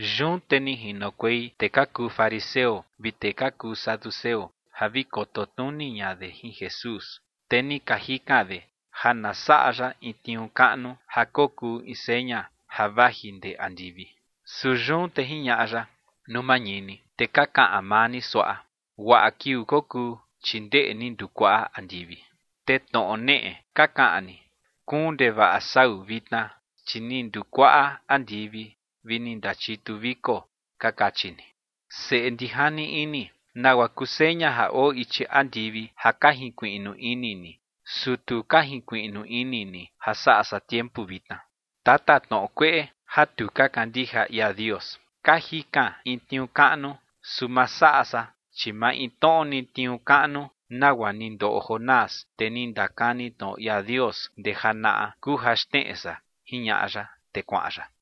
Yun te ni jinokuei tee ka kuu fariseo vi tee ka kuu saduceo ja vi koto tnuni ña de jin Jesús, te ni ka jikan de ja na saꞌa ya in tniuu kaꞌnu ja kokuu in seña ja vaji ndee andivi. Su yun te jiñaꞌa ya: ͏―͏Nuu mañini, te ka kaꞌan maa ni suaꞌa: “Guaꞌa kiuu kokuu, chi ndeꞌe ni ndukuaꞌa andivi”. Te tnoꞌo neꞌe ka kaꞌan ni: “Kuun ndevaꞌa sau vitna, chi ni ndukuaꞌa andivi vi ni ndachitu viko”, ka kachi ni. ¡Seꞌe ndijani ini! ¿Nagua kuu seña ja oo ichi andivi ja ka jinkuiꞌnu ini ni, su tu ka jinkuiꞌnu ini ni ja saꞌa san tiempu vitna? Tatatnoꞌo kueꞌe ja tu ka kandija ia Dios, ka jikan in tniuu kaꞌnu, su ma saꞌa san, chi maintnoꞌo ni tniuu kaꞌnu nagua ni ndoꞌo Jonás, tee ni ndakani tnoꞌo ia Dios ndee janaꞌa, kuu ja xneꞌe san ͏―͏jiñaꞌa ya, te kuaꞌan ya.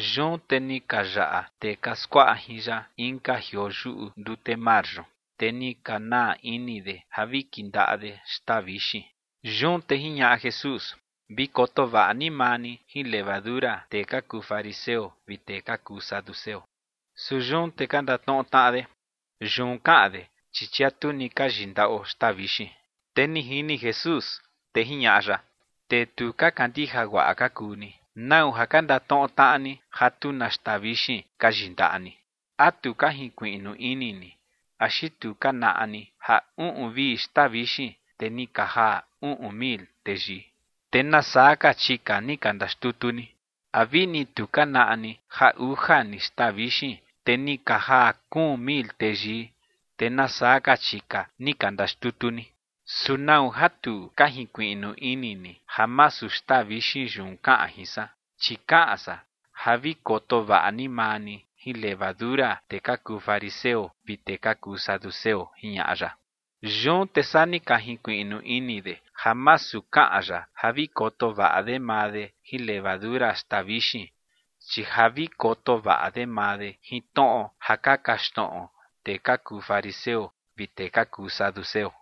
Yun te ni ka yaꞌa tee ka skuaꞌa jin ya inka jioo yuꞌu ndute mar yun, te ni ka naa ini de ja vi kindaꞌa de xtaa vixin. Yun te jiñaꞌa Jesús: ͏―͏Vi koto vaꞌa ni maa ni jin levadura tee ka kuu fariseo vi tee ka kuu saduceo. Su yun te ka ndatnoꞌo tnaꞌa de: ͏―͏Yun kaꞌan de, chi chia tu ni ka yindaꞌo xtaa vixin. Te ni jini Jesús, te jiñaꞌa ya: ͏―͏Tee tu ka kandija guaꞌa ka kuu ni. ¿Nau ja ka ndatnoꞌo tnaꞌa ni ja tu na xtaa vixin ka yindaꞌa ni? ¿A tu ka jinkuiꞌnu ini ni? ¿Axi tu ka naꞌa ni ja uꞌun vi xtaa vixin, te ni ka jaa uꞌun mil teyii, te nasaa ka chika ni ka ndaxtutu ni? ¿A vini tu ka naꞌa ni ja uja ni xtaa vixin, te ni ka jaa kuun mil teyii, te nasaa ka chika ni ka ndaxtutu ni? ¿Su nau ja tu ka jinkuiꞌnu ini ni ja masu xtaa vixin yun kaꞌan jin san? Chi kaꞌan san ja vi koto vaꞌa ni maa ni jin levadura tee ka kuu fariseo vi tee ka kuu saduceo ͏―͏jiñaꞌa ya. Yun te saa ni ka jinkuiꞌnu ini de ja masu kaꞌan ya ja vi koto vaꞌa de maa de jin levadura xtaa vixin, chi ja vi koto vaꞌa de maa de jin tnoꞌo ja ka kaxtnoꞌo tee ka kuu fariseo vi tee ka kuu saduceo.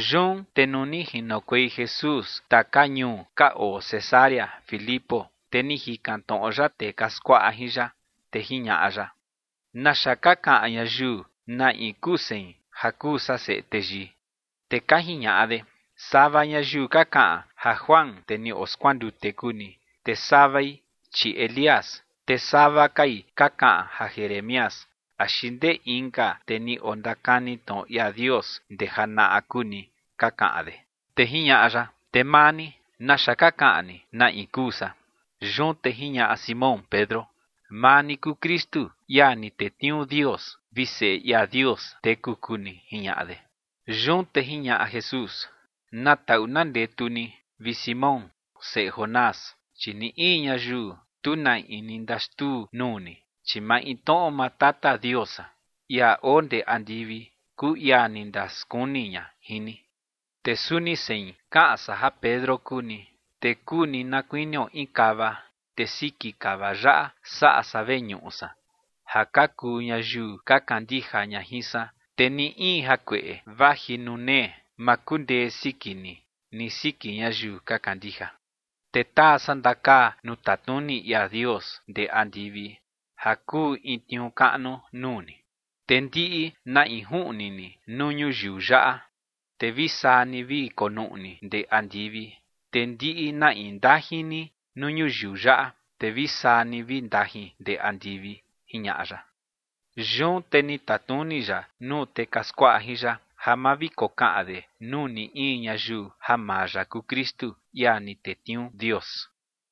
Yun te nuu ni jinokuei Jesús taka ñuu ka oo Cesarea Filipo, te ni jikan tnoꞌo ya tee ka skuaꞌa jin ya, te jiñaꞌa ya: ͏―͏¿Naxa ka kaꞌan ñayiu na in kuu sein ja kuu san Seꞌe Teyii? Te ka jiñaꞌa de: ͏―͏Sava ñayiu ka kaꞌan ja Juan, tee ni oskuandute kuu ni, te savai, chi Elías, te sava kai ka kaꞌan ja Jeremías axi ndee inka tee ni ondakani tnoꞌo ia Dios ndee janaꞌa kuu ni ͏―͏ka kaꞌan de. Te jiñaꞌa ya: ͏―͏Te maa ni, ¿naxa ka kaꞌan ni, na in kuu san? Yun te jiñaꞌa Simón Pedro: ͏―͏Maa ni kuu Kristu, ia ni tetniuu Dios, vi Seꞌe ia Dios teku kuu ni ͏―͏jiñaꞌa de. Yun te jiñaꞌa Jesús: ͏―͏Na taꞌu na ndetu ni, vi Simón seꞌe Jonás, chi ni in ñayiu tu na in ni ndaxtuu nuu ni, chi maintnoꞌo maa Tata Dios san, ia oo ndee andivi, kuu ia ni ndaskuni ña jin ni. Te suni sein kaꞌan san ja Pedro kuu ni, te kuu ni na kuinio in kava, te siki kava yaꞌa saꞌa san veñuꞌu san ja ka kuu ñayiu ka kandija ña jin san, te ni in jakueꞌe vaji nuu nee ma kundee siki ni ni siki ñayiu ka kandija. Te taa san ndakaa nuu tatnuni ia Dios ndee andivi ja kuu in tniuu kaꞌnu nuu ni, te ndiꞌi na in juꞌni ni nuu ñuyiu yaꞌa, te vi saa ni vi konuꞌni ndee andivi, te ndiꞌi na in ndajin ni nuu ñuyiu yaꞌa, te vi saa ni vi ndajin ndee andivi ͏―͏jiñaꞌa ya. Yun te ni tatnuni ya nuu tee ka skuaꞌa jin ya ja ma vi kokaꞌan de nuu ni in ñayiu ja maa ya kuu Kristu, ia ni tetniuu Dios.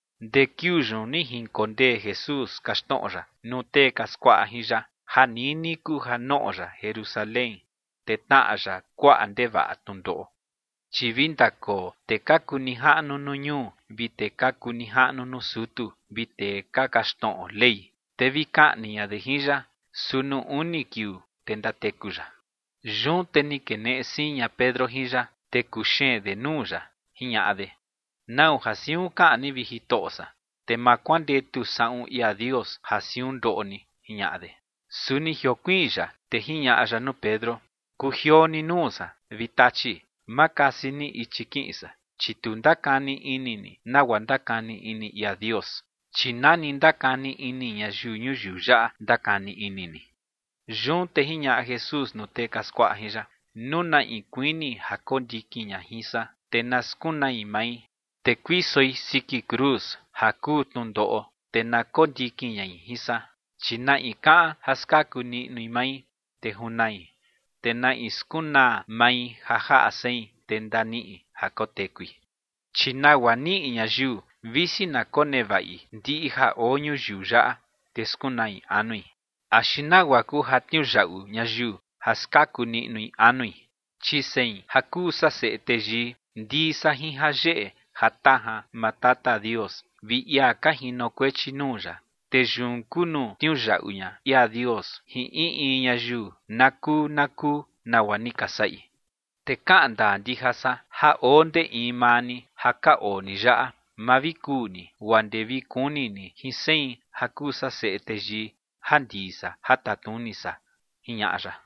Ndee kiuu yun ni jinkondee Jesús kaxtnoꞌo ya nuu tee ka skuaꞌa jin ya ja nini kuu ja noꞌo ya Jerusalén, te tnaꞌa ya kuaꞌa ndevaꞌa tnundoꞌo, chi vi ndakoo tee ka kuu nijaꞌnu nuu ñuu, vi tee ka kuu nijaꞌnu nuu sutu, vi tee ka kaxtnoꞌo Ley, te vi kaꞌni ña de jin ya, su nuu uni kiuu, te ndateku ya. Yun te ni keneꞌe siin ña Pedro jin ya, te kuxeen de nuu ya, jiñaꞌa de: ͏―͏¿Nau ja siun kaꞌan ni, vi Jitoꞌo san? Te ma kuandetu saꞌun ia Dios ja siun ndoꞌo ni ͏―͏jiñaꞌa de. Su ni jiokuiin ya, te jiñaꞌa ya nuu Pedro: ͏―͏Kujioo ni nuu san, vi Tachi, ma kasi ni ichi kiꞌin san. Chi tu ndakani ini ni nagua ndakani ini ia Dios, chi na ni ka ndakani ini ñayiu ñuyiu yaꞌa ndakani ini ni. Yun te jiñaꞌa Jesús nuu tee ka skuaꞌa jin ya: ͏―͏Nuu na in kuini ja kondikin ña jin san, te na skunai mai, te kuisoi siki cruz ja kuu tnundoꞌo, te na kondikin ñai jin san. Chi na in kaꞌan ja skaku niꞌnui mai, te junai. Te na in skunaa mai ja jaꞌa sein, te ndaniꞌi ja kotekui. Chi ¿nagua niꞌi ñayiu visi na konevaꞌi ndiꞌi ja oo ñuyiu yaꞌa, te skunai anui? ¿Axi nagua kuu ja tniuyaꞌu ñayiu ja skaku niꞌnui anui? Chi sein ja kuu san Seꞌe Teyii, ndii san jin jayeꞌe jatajan maa Tata Dios vi ia ka jinokuechi nuu ya. Te yun kuu nuu tniuyaꞌu ña ia Dios jin in in ñayiu na kuu na kuu nagua ni ka saꞌi. Te kaꞌan ndaa ndija san ja oo ndee in maa ni ja ka oo ni yaꞌa, ma vi kuu ni guaa ndee vi kuni ni jin sein ja kuu san Seꞌe Teyii ja ndii san ja tatnuni san ͏―͏jiñaꞌa ya.